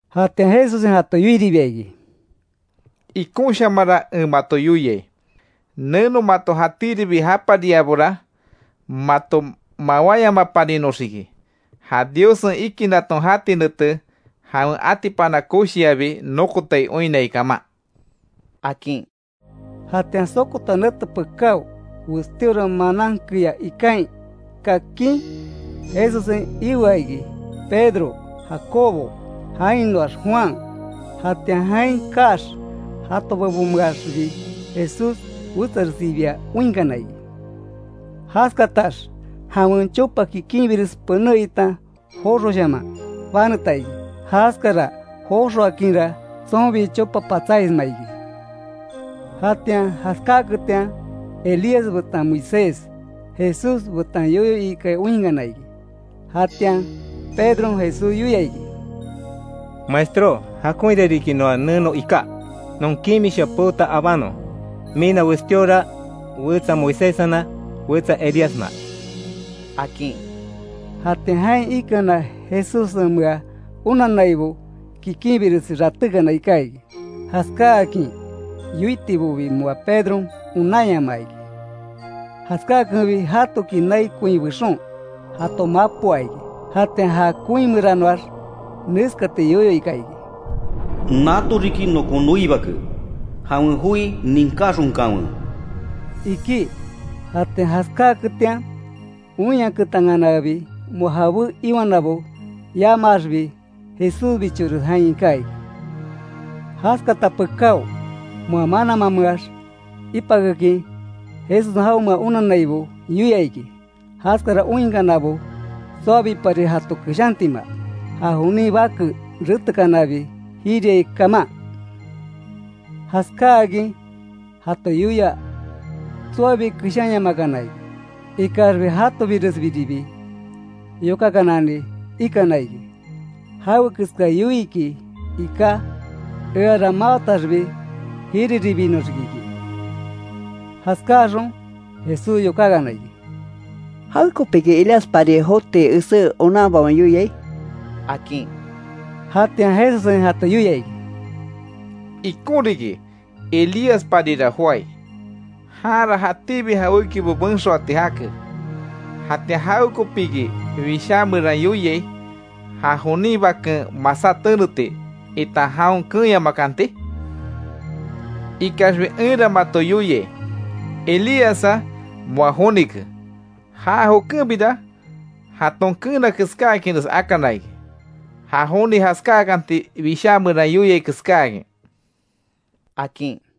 Jatian Jesussen jato yoiribia iki: —Ikonshamanra en mato yoiai; Neno mato jatíribi japariabora, mato mawáyamaparinoxiki, ja Diossen ikinnaton jatí nete, jawen atipana koshiabi nokotai oinnai kaman —akin. Jatian sokota nete pekáo, westíora manan keyá ikain kakin Jesussen ioa iki: Pedro, Jacobo, jainoax Juan. Jatian jain kaax jato bebonmeaxbi Jesús wetsaresibia oinkana iki. Jaskatax jawen chopa kikinbires pené itan joxoshaman baneta iki. Jaskara joxoakinra, tsonbi chopa patsáisma iki. Jatian jaskáaketian, Elías betan Moisés, Jesús betan yoyo ikai oinkana iki. Jatian, Pedron Jesús yoia iki: —Maestro, Jakonhira riki noa neno iká. Non kimisha peota abanon; mina westíora, wetsa Moiséssena, wetsa Elíasna —akin. Jatian jain ikana Jesussenmea onannaibo, kikinbiresi ratékana iká iki. Jaskáakin yoitibobi moa Pedron onanyamaa iki. Jaskákenbi, jatoki nai koin bexon, jato mapoa iki. Jatian ja koin meranoax, neskati yoyo ika iki: —Nato riki nokon noi Bake, jawen joi ninkaxonkanwe —iki. Jatian jaskáketian, oinyaketankanabi, moa jabé iwanabo yamaaxbi, Jesúsbichores jain iká iki. Jaskata pekáo, moa mananmameax ipakekin, Jesussen jaonmea onannaibo yoia iki, jaskara oinkanabo tsoabipari jato keshantima. Ja jonin Bake ratekanabi, jiriai kaman. Jaskáakin jato yoia, tsoabi keshanyamakana iki. Ikaxbi jatobiresbiribi yokakanani ikana iki, jawe keska yoiiki iká, eara mawataxbi, jiriribinoxiki iki. Jaskáxon, Jesús yokákana iki: —¿Jawekopiki Elíaspari joti esé onanbaon yoiai? —akin. Jatian Jesussen jato yoia iki: —Ikon riki, Elíasparira joái. Janra jatíbi jawékibo benxoati jake. Jatian ¿Jawekopiki Wishá meran yoiai, ja jonin Baken masá teneti, itan jaon keenyamakanti? Ikaxbi enra mato yoiai, Elíassa moa jonike. Já jokenbira, jaton keena keskáakinres akana iki. Ja joni jaskáakanti Wishá meran yoiai keskáakin —akin.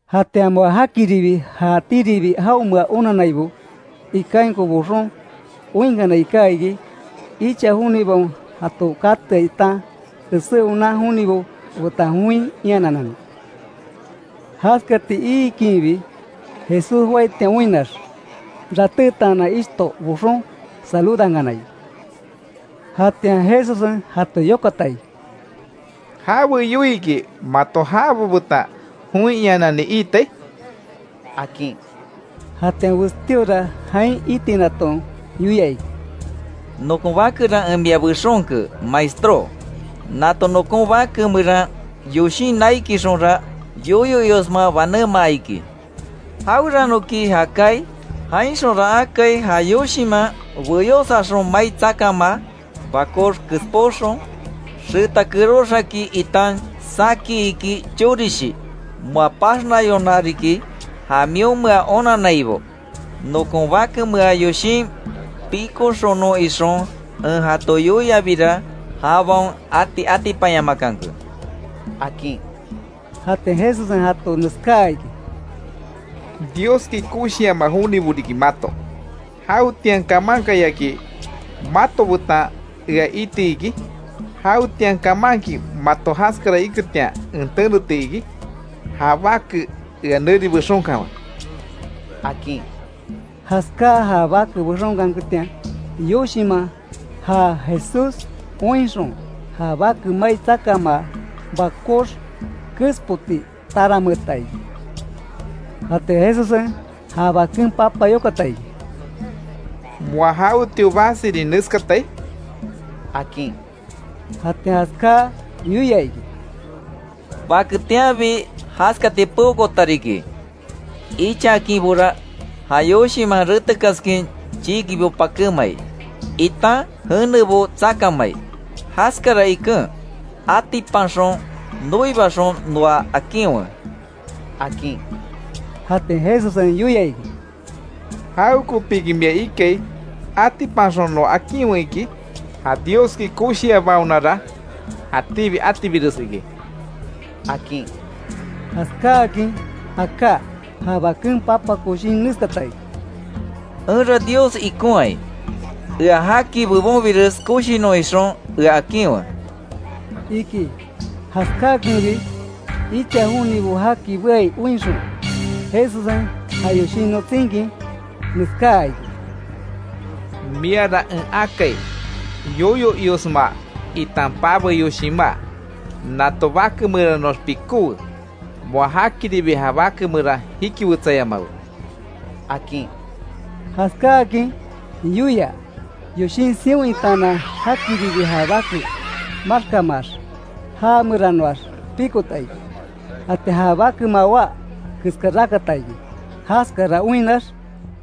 Jatian moa jakiribi ja jatíribi jaonmea onannaibo ikainko boxon oinkana iká iki, icha jonibaon jato katea itan esé onan jonibo betan join iananani. Jaskati iikinbi, Jesús joaitian oinnax, ratétaanan ishto boxon, saludankana iki. Jatian Jesussen jato yokata iki: —¿Jawe yoiiki mato jabo betan join iananani iitai? —akin. Jatian westíora jain itinaton yoia iki: —Nokon bakera en mia bexonke, Maestró. Nato nokon bake meran yoshin naikixonra yoyo iosma banémaa iki. Jaweranoki já kaai, jainxonra akai ja yoshinman beyósaxon mai tsakamaa, bakox kespoxon, xeta keróx akin itan saki iki chorishi. Moa paxnayona riki. Ja mionmea onannaibo, nokon bakemea yoshin pikoxonon ixon en jato yoiabira, jabaon ati atipanyamakanke —akin. Jatian Jesussen jato neskáa iki: —¡Dioski koshiama jonibo riki mato! ¿Jawetian kamankayaki mato betan ea iti iki? ¿Jawetian kamanki mato jaskara iketian en teneti iki? Ja bake ea neri bexonkanwe —akin. Jaskáa ja bake bexonkanketian, yoshinman, ja Jesús oinxon, ja bake mai tsakamaa, bakox kespoti tarameeta iki. Jatian Jesussen, ja baken papa yokata iki: —¿Moa jawetio basirin neskatai? —akin. Jatian jaskáa yoia iki: —Baketianbi jaskati peokoota riki. Ichakinbora, ja yoshinman retekaskin, chiikibo pakémai, itan jenebo tsakamai. Jaskara iken, atipanxon, noibaxon noa akinwe —akin. Jatian Jesussen yoia iki: —¿Jawekopiki mia ikai, atipanxon, noa akinwe iki? Ja Dioski koshiabaonara, jatíbi atibires iki —akin. Jaskáakin aká, ja baken papa koshin neskata iki: —¡Enra Dios ikonhai. Ea jaki bebonbires koshinon ixon ea akinwe! —iki. Jaskáakenbi, icha jonibo jaki beai oinxon, Jesussen ja yoshin notsinkin, neskáa iki: —Miara en akai, yoyo iosma, itan pabe yoshinmá. Nato bake meranoax pikówe, moa jakiribi, ja bake meran jikiwetsayamawe —akin. Jaskáakin yoia, yoshin sion itaanan jakiribi ja bake maxkamaax, já meranoax pikota iki. Jatian ja bake mawá keska rakata iki. Jaskara oinnax,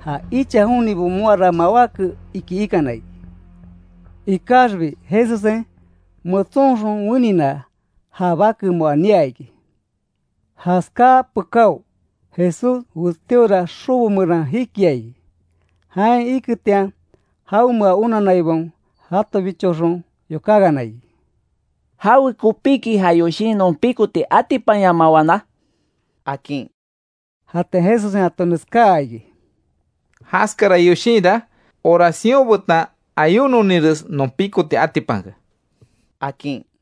ja icha jonibo moara mawáke iki ikana iki. Ikaxbi Jesussen, metsonxon wenina, ja bake moa nia iki. Jaskáa pekáo, Jesús westíora xobo meran jikia iki. Jain iketian, jaonmea onanaibaon jatobichoxon yokákana iki: —¿Jawekopiki ja yoshin non pikoti atipanyamawana? —akin. Jatian Jesussen jato neskáa iki: —Jaskara yoshinra, oración betan ayunoninres non pikoti atipanke —akin.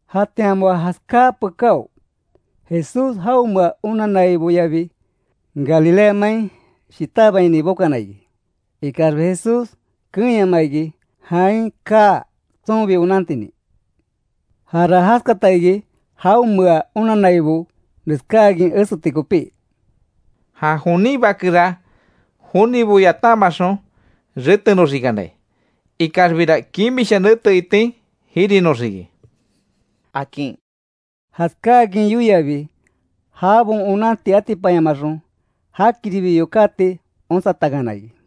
Jatian moa jaskáa pekáo, Jesús jaonmea onanaiboyabi, Galilea main shitabaini bokana iki. Ikaxbi Jesús keenyamaa iki, jain kaa tsonbi onantinin. Jara jaskata iki jaonmea onannaibo neskáakin eseti kopí: —Ja jonin Bakera, jonibo yatamaxon retenoxikanai, ikaxbira, kimisha nete itin jirinoxiki —akin. Jaskákin yoiabi, jabaon onanti atipanyamaxon, jakiribi yokáti onsatankana iki.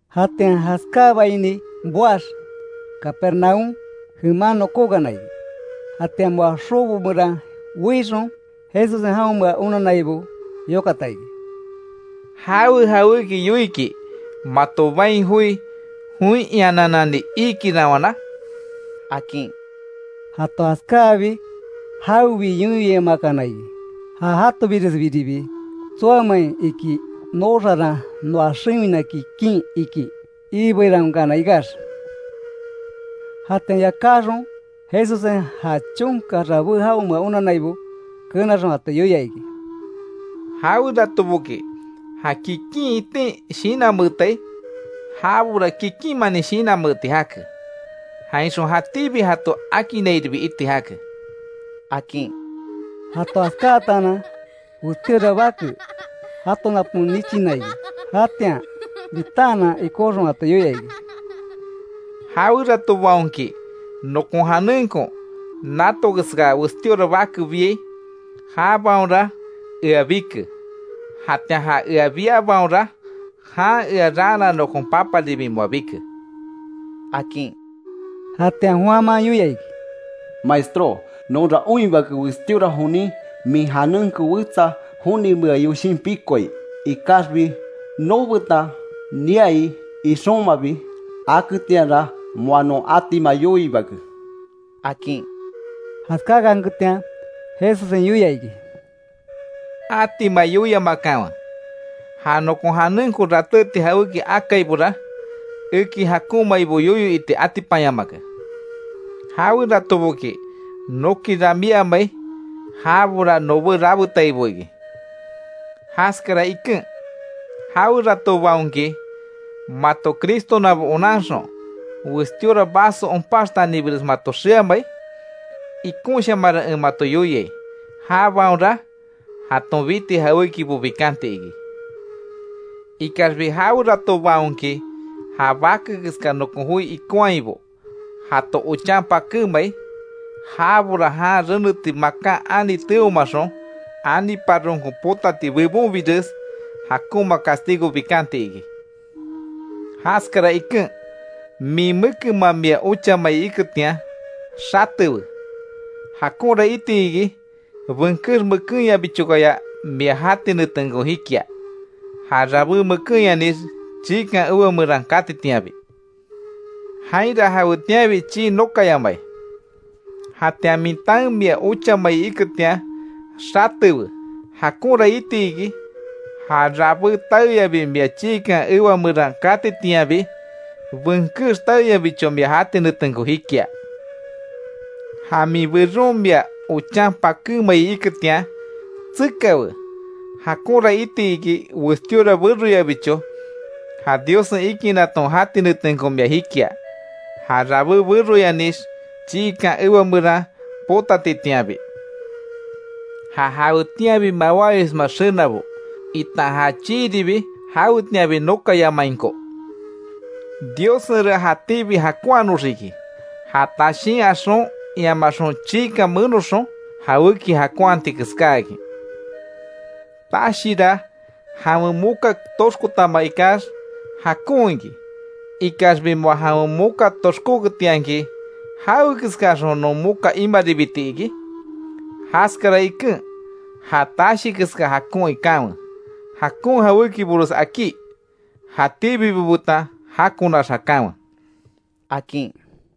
Jatian jaskábaini boax, Capernaúm jeman nokókana iki. Jatian moa xobo meran weixon, Jesussen jaonmea onannaibo yokata iki: —¿Jawe jawéki yoiiki mato bain joi, join iananani iikiranwana? —akin. Jato jaskáabi, jawebi yoyo iamakana iki. Ja jatobiresbiribi tsoamein iki nooxaran noa xewina kikin iki iibeirawankana ikax. Jatian yakáxon Jesussen, ja chonka rabé jaonmea onannaibo, kenaxon jato yoia iki: —Jaweratoboki ja kikin itin shinanmeetai, jabora kikinmanin shinanmeeti jake. Jainxon jatíbi jato akinnairibi iti jake —akin. Jato jaskáatanan, westíora bake, jato napon nichina iki. Jatian bitaanan ikóxon jato yoia iki: —Jaweratobaonki nokon janenko nato keska westíora bake biai, jabaonra ea bike; jatian ja ea biabaonra, jan ea raana nokon Paparibi moa bike —akin. Jatian Juanman yoia iki: —Maestró, nonra oinhibake westíora jonin, min janenko wetsa jonimea yoshin pikoai. Ikaxbi noobetan niai ixonmabi aketianra, moa non atima yoiibake —akin. Jaskákanketian Jesussen yoia iki: —Atima yoiamakanwe. Ja nokon janenko ratéti jawéki akaibora, eki jakonmaibo yoyo iti atipanyamake. Jaweratoboki noki ramíamai, jabora nobé rabetaibo iki. Jaskara iken, jaweratobaonki mato Cristonabo onanxon, westíora vaso onpaxtanibires mato xeamai, ikonshamanra en mato yoiai, jabaonra jaton biti jawékibo bikanti iki. Ikaxbi jaweratobaonki ja bake keska nokon joi ikonhaibo, jato ochan pakémai, jabora jan reneti makan ani teomaxon, aniparonko potati, bebonbires jakonma castigo bikanti iki. Jaskara iken, min mekenman mia ochamai iketian, xatewe. Jakonra iti iki benkex mekenyabichokaya mia jati netenko jikia, ja rabé mekenyanix, chiikan ewa meran katitianbi. [Jainra jawetianbi chii nokayamai] Jatian min taen mia ochamai iketian, xatewe. Jakonra iti iki ja rabé taeyabi mia chiikan ewa meran katitianbi, benkex taeyabicho mia jati netenko jikia. Ja min beron mia ochan pakémai iketian, tsekawe. Jakonra iti iki, westíora beroyabicho ja Diossen ikinnaton jati netenko mia jikia, ja rabé beroyanix chiikan ewa meran potatitianbi, ja jawetianbi mawáyosma xenabo, itan ja chiiribi jawetianbi nokayamainko. Diossenra jatíbi jakonhanoxiki, ja tashín axon iamaxon chiikan menoxon jawéki jakonhati keskáakin. Tashira jawen moka toxkotama ikax, jakon iki. Ikaxbi moa jawen moka toxkóketianki ¿Jawe keskaxon non moka imaribiti iki? Jaskara iken, ja tashi keska jakon ikanwe, jakon jawékibores akí, jatíbibo betan jakonax jakanwe —akin.